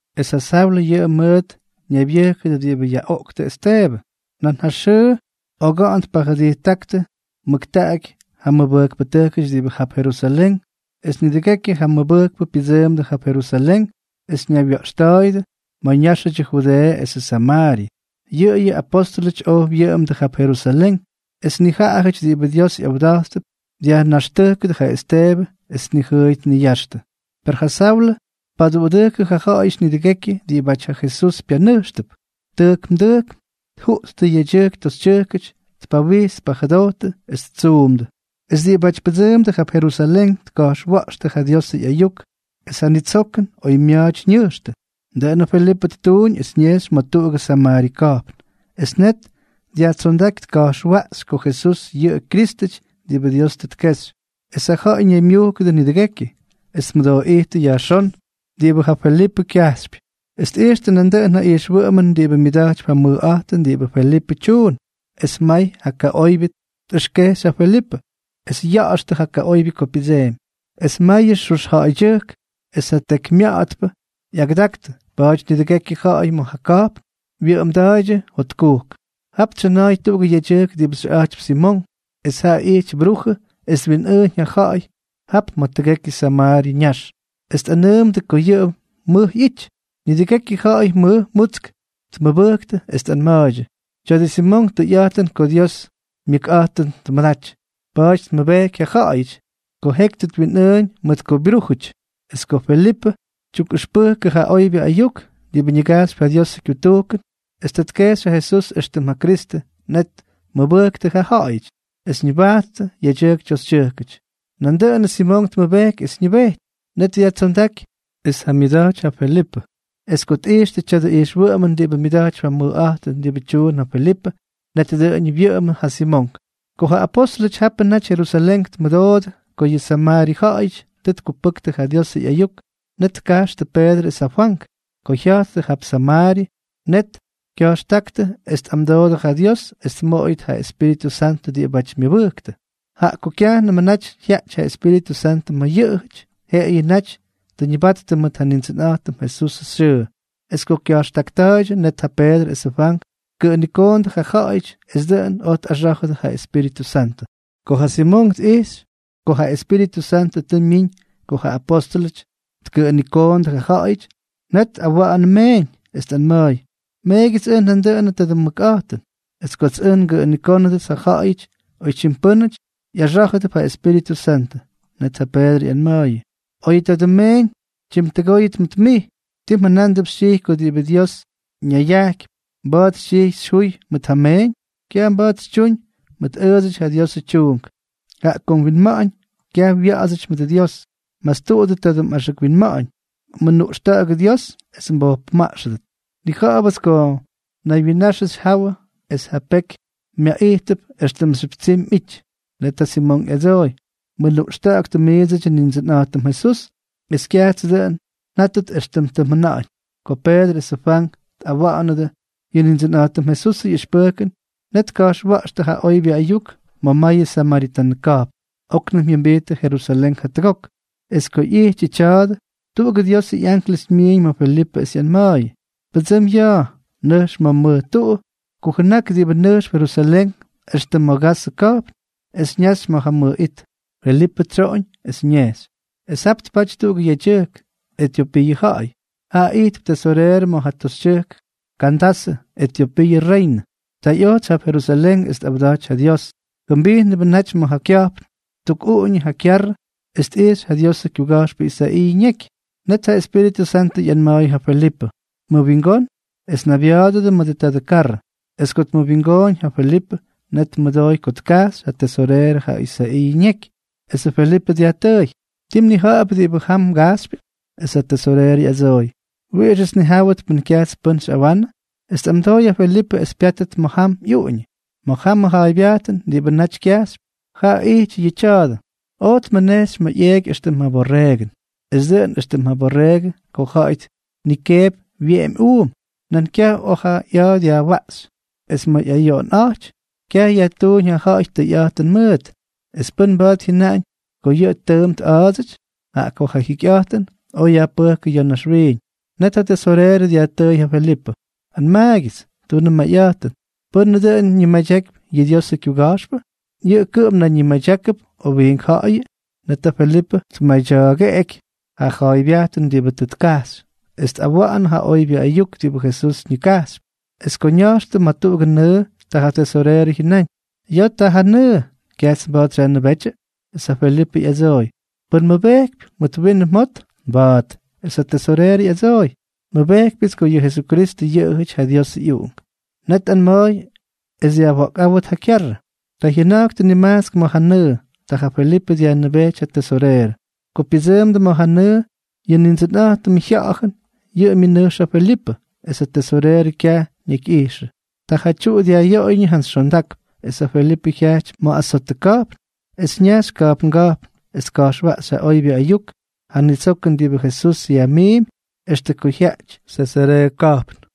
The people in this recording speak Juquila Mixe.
Es ja Saulʉ yʉꞌʉ mʉʉt ñaybyʉjkʉdʉ diꞌibʉ yaꞌoꞌkʉ Esteebʉ. Nan ja xʉʉ oga̱ꞌa̱n tpajʉdijttáktʉ mʉktaꞌaky ja mʉbʉjkpʉtʉjkʉty diꞌibʉ jap Jerusalén. Es nidʉgekyʉ ja mʉbʉjkpʉ pyʉdsʉʉmdʉ jap Jerusalén es ñaywya̱ꞌxta̱a̱yʉdʉ ma̱ ñáxʉdyʉ Judeeʉ esʉ Samaaryʉ. Yʉꞌʉyʉ apóstʉlʉty oj wyʉꞌʉmdʉ jap Jerusalén. Es nijaꞌajʉty diꞌibʉ Dios ꞌyawda̱jttʉp, dyajnaxtʉjkʉdʉ ja Esteebʉ es tnijʉʉy tniyaxtʉ. Per ja Saulʉ tpaduꞌudʉjkʉ ja ja̱ꞌa̱yʉty nidʉgekyʉ diꞌibáty ja Jesús pyanʉjxtʉp, tʉjkm tʉjkm tjuꞌttʉ yedyʉjk toxytyʉjk, tpawijts tpajʉdojttʉ es ttsuumdʉ. Es diꞌibáty pʉdsʉʉmdʉ jap Jerusalén tka̱jxwa̱ꞌxtʉ ja Diosʉ ꞌyayuk es ja ñitsokʉn oymya̱a̱ty ñʉjxtʉ. Dʉꞌʉnʉ Felipʉ ttuuñ es ñejxy ma̱ tuꞌugʉ Samaaryʉ ka̱jpn. Es net dyajtsondáky tka̱jxwaꞌxy ko Jesús yʉꞌʉ Kyrístʉty diꞌibʉ Dios tʉ tkexy. Es ja ja̱ꞌa̱y ñaymyujkʉdʉ nidʉgekyʉ, es tmʉdooꞌijttʉ yajxón diꞌibʉ ja Felipʉ kyajxypy, es tꞌijxtʉ nandʉꞌʉn ja ijxwʉꞌʉmʉn diꞌibʉ myʉda̱jtypy ja mʉjꞌa̱jtʉn diꞌibʉ Felipʉ tyuun. Es may ja kaꞌoybyʉ tꞌʉxkejxy ja Felipʉ, es ya̱ꞌa̱xtʉ ja kaꞌoybyʉ ko pyʉdsemy. Es mayʉ xux ja̱ꞌa̱ydyʉjk es ja tekymya̱ꞌa̱tpʉ ꞌyagʉdaktʉ. Pa̱a̱ty nidʉgekyʉ ja̱ꞌa̱y ma̱ ja ka̱jpn wyʉꞌʉmda̱a̱ydyʉ jotkujk. Jap tsyʉna̱a̱y tuꞌugʉ yedyʉjk diꞌibʉ xʉꞌa̱jtypy Simonk. Es jaꞌa ijty brujʉ es twinꞌʉʉñ ja ja̱ꞌa̱y jap ma̱ tʉgekyʉ Samaaryʉ ñax es tꞌanʉʉmʉdʉ ko yʉꞌʉ mʉj ꞌyity. Nidʉgekyʉ ja̱ꞌa̱y mʉj mutsk tmʉbʉjktʉ es tꞌanma̱a̱ydyʉ: —Tya̱dʉ Simonk tʉyꞌa̱jtʉn ko Diosʉ myʉkꞌa̱jtʉn tmʉdaty. Pa̱a̱ty tmʉbejky ja ja̱ꞌa̱yʉty ko jeky tʉ twinꞌʉʉñ mʉt ko byrújʉty. Es ko Felipʉ tyukꞌʉxpʉjkʉ ja oybyʉ ayuk diꞌibʉ ñigajxypy ja Diosʉ kyutujkʉn, es tʉ tkexy ja Jesús éxtʉm ja Kristʉ, net tmʉbʉjktʉ ja ja̱ꞌa̱yʉty es ñʉbajttʉ, yedyʉjk toxytyʉjkʉty. Nandʉꞌʉnʉ Simonk tmʉbejky es ñʉbejty. Net dyajtsondáky es tjamyʉda̱jty ja Felipʉ. Es ko tꞌijxyʉ tya̱dʉ ijxwʉꞌʉmʉn diꞌibʉ myʉda̱jtypy ja mʉjꞌa̱jtʉn diꞌibʉ tyuun ja Felipʉ, net dʉꞌʉñʉ wyʉꞌʉmʉ ja Simonk. Ko ja apóstʉlʉty japʉ naty Jerusalén tmʉdoodʉ ko yʉ Samaaryʉ ja̱ꞌa̱yʉty tʉ tkupʉktʉ ja Diosʉ ꞌyayuk, net tkajxtʉ Peedrʉ es ja Fwank. Ko jya̱jttʉ jap Samaaryʉ, net kya̱jxtáktʉ es tꞌamdoodʉ ja Dios es tmoꞌoyʉt yʉ Espíritʉ Santʉ diꞌibáty myʉbʉjktʉ, jaꞌa ko kyajnʉmʉ naty jyaꞌty ja Espíritʉ Santʉ ma̱ yʉꞌʉjʉty, jeꞌeyʉ naty tʉ ñʉbattʉ mʉt ja Nindsʉnꞌa̱jtʉm Jesusʉ xyʉʉ. Es ko kya̱jxtakta̱a̱ydyʉ, net ja Peedrʉ esʉ Fwank tkʉꞌʉnikoondʉ ja ja̱ꞌa̱yʉty, es dʉꞌʉn oj tꞌaxá̱jʉdʉ ja Espíritʉ Santʉ. Ko ja Simonk tꞌijxy ko ja Espíritʉ Santʉ tʉ myiñ ko ja apóstʉlʉty tkʉꞌʉnikoondʉ ja ja̱ꞌa̱yʉty, net tꞌawa̱ꞌa̱nʉ meeñ, es tꞌanma̱a̱y: —Meegyʉts ʉj nandʉꞌʉnʉ tadʉ mʉkꞌa̱jtʉn, es kots ʉj ngʉꞌʉnikónʉdʉts ja ja̱ꞌa̱yʉty oytyim pʉ́nʉty, ꞌyaxá̱jʉdʉp ja Espíritʉ Santʉ. Net ja Peedrʉ ꞌyanma̱a̱yʉ: —Oyʉ tadʉ mmeeñ tyimtʉgóyʉt mʉt mij. ¿Tii mjʉna̱a̱mp xytyijy ko diꞌibʉ Dios ñayajkypy, mba̱a̱t xytyijy yajjúy mʉt ja meeñ? Kyaj mba̱a̱t xytyuñ mʉt ʉʉdsʉty ja Diosʉ tyuunk, jaꞌa ko mwinma̱ꞌa̱ñ kyaj wya̱ꞌa̱dsʉty mʉdʉ Dios. Mastuꞌudʉ tadʉ mꞌaxʉk winma̱ꞌa̱ñ. Mʉnuꞌxta̱ꞌa̱gʉ Dios es mbojpʉmaꞌxʉdʉt. Nnija̱ꞌa̱bʉts ko naywyinnaxʉ xyjawʉ es ja peky myaꞌijtʉp éxtʉmxyʉp tsimy mꞌity. Net ja Simonk ꞌyadsooy: —Mʉnuꞌxta̱ꞌa̱ktʉ miidsʉdyʉ Nindsʉnꞌa̱jtʉm Jesús es kyajts ʉj dʉꞌʉn njátʉt éxtʉm tʉ mjʉna̱ꞌa̱ñ. Ko Peedrʉ es ja Fwank tꞌawa̱ꞌa̱nʉdʉ yʉ Nindsʉnꞌa̱jtʉm Jesusʉ ꞌyʉxpʉjkʉn, net tka̱jxwa̱ꞌxtʉ ja oybyʉ ayuk ma̱ mayʉ samaritanʉ ka̱jpn. Oknʉm jyʉmbijttʉ Jerusalén jatʉgok. Es ko ꞌyijtyʉ tya̱a̱dʉ, tuꞌugʉ Diosʉ ꞌyanklʉs myiiñ ma̱ Felipʉ es ꞌyanma̱a̱yʉ: —Pʉdsʉm ya̱a̱. Nʉjx ma̱ mʉj tuꞌu kujʉnak diꞌibʉ nʉjxp Jerusalén extʉ ma̱ Gazʉ ka̱jpn es ñaxy ma̱ ja mʉj it. Felipʉ tsyoꞌoñ es ñejxy. Es jap tpaty tuꞌugʉ yedyʉjk, Etyopiiʉ ja̱ꞌa̱y. Jaꞌa ijtp tesoreerʉ ma̱ ja toxytyʉjk Kandasʉ, Etyopiiʉ reynʉ. Tʉ ꞌyotsy jap Jerusalén es tꞌawdaty ja Dios. Jʉmbijnʉbʉ naty ma̱ ja kya̱jpn, ttukꞌuꞌuñʉ ja kyarrʉ es tꞌixy ja Diosʉ kyuga̱jxpʉ Isaiiʉ ñeky. Net ja Espíritʉ Santʉ ꞌyanma̱a̱yʉ ja Felipʉ: —Mʉwingón es naybya̱a̱dʉdʉ mʉdʉ tadʉ karrʉ. Es ko tmʉwingooñ ja Felipʉ, net tmʉdooy ko tkajxy ja tesoreerʉ ja Isaiiʉ ñeky. Esʉ Felipʉ dyajtʉʉy: —¿Ti mnija̱ꞌa̱p diꞌibʉ jam mgajxypyʉ? Es ja tesoreerʉ ꞌyadsooy: —¿Wiꞌixʉts nnijáwʉt pʉn kyajts pʉ́n xyꞌawanʉ? Es tꞌamdooy ja Felipʉ es pyátʉt ma̱ jam ꞌyuꞌuñʉ. Ma̱ jamʉ ja̱a̱ybyajtʉn diꞌibʉ naty kyajxypy, ja ijty yʉ tya̱a̱dʉ: Oj tmʉnejxy ma̱ ꞌyeꞌky éxtʉm ja borreegʉn. Es dʉꞌʉn éxtʉm ja borreegʉ ko ja̱ꞌa̱y tnikeepy wyeꞌemy uum, nan kyaj oj ja ꞌya̱a̱ dyajwaꞌxy. Es ma̱ ꞌyayoꞌonꞌa̱jty, kyaj yajtuuñ ja ja̱ꞌa̱y tʉyꞌa̱jtʉn mʉʉt. ¿Es pʉ́n mba̱a̱t jyʉnaꞌañ ko yʉꞌʉ ttʉʉmp tꞌa̱a̱dsʉty?, jaꞌa ko ja jyikyꞌa̱jtʉn oj yajpʉjkʉ ya̱ naxwiiñ. Net ja tesoreerʉ dyajtʉʉy ja Felipʉ: —Anmaagyʉts, tunʉ mayꞌa̱jtʉn, ¿pʉ́nʉ dʉꞌʉn ñimadyakypy yʉ Diosʉ kyuga̱jxpʉ? ¿Yʉꞌʉ kʉꞌʉm nayñimadyákʉp, o wiink ja̱ꞌa̱yʉ? Net ja Felipʉ tmadya̱a̱geꞌky ja ja̱a̱ybyajtʉn diꞌibʉ tʉ tkajxy, es tꞌawa̱ꞌa̱nʉ ja oybyʉ ayuk diꞌibʉ Jesús ñigajxypy. Es ko ña̱jxtʉ ma̱ tuꞌugʉ nʉʉ, ta ja tesoreerʉ jyʉnáñ: —Ya̱a̱ ta ja nʉʉ. ¿Kyajts mba̱a̱t xyajnʉbétyʉ? Es ja Felipʉ ꞌyadsooy: —Pʉn mmʉbejkypy mʉt winʉ mjot, mba̱a̱t. Es ja tesoreerʉ ꞌyadsooy: —Nmʉbejkypyʉts ko yʉ Jesukristʉ yʉꞌʉjʉty ja Diosʉ ꞌyUꞌunk. Net tꞌanma̱a̱y es dyajwa̱ꞌkꞌáwʉt ja kyarrʉ. Ta jyʉna̱jktʉ nimajtsk ma̱ ja nʉʉ. Ta ja Felipʉ dyajnʉbejty ja tesoreerʉ. Ko pyʉdsʉʉmdʉ ma̱ ja nʉʉ, yʉ Nindsʉnꞌa̱jtʉmʉ Jya̱ꞌa̱jʉn yʉꞌʉ myʉnʉjx ja Felipʉ, es ja tesoreerʉ kyaj ñakyꞌijxʉ. Ta ja tyuꞌu dyajꞌyoꞌoyñʉ jantsy xondakp. Es ja Felipʉ jyajty ma̱ Azotʉ ka̱jpn, es ñajxy ka̱jpnga̱jpn es tka̱jxwaꞌxy ja oybyʉ ayuk, ja nitsokʉn diꞌibʉ Jesús yajmiimpy, extʉ ko jyajty Sesareeʉ ka̱jpn.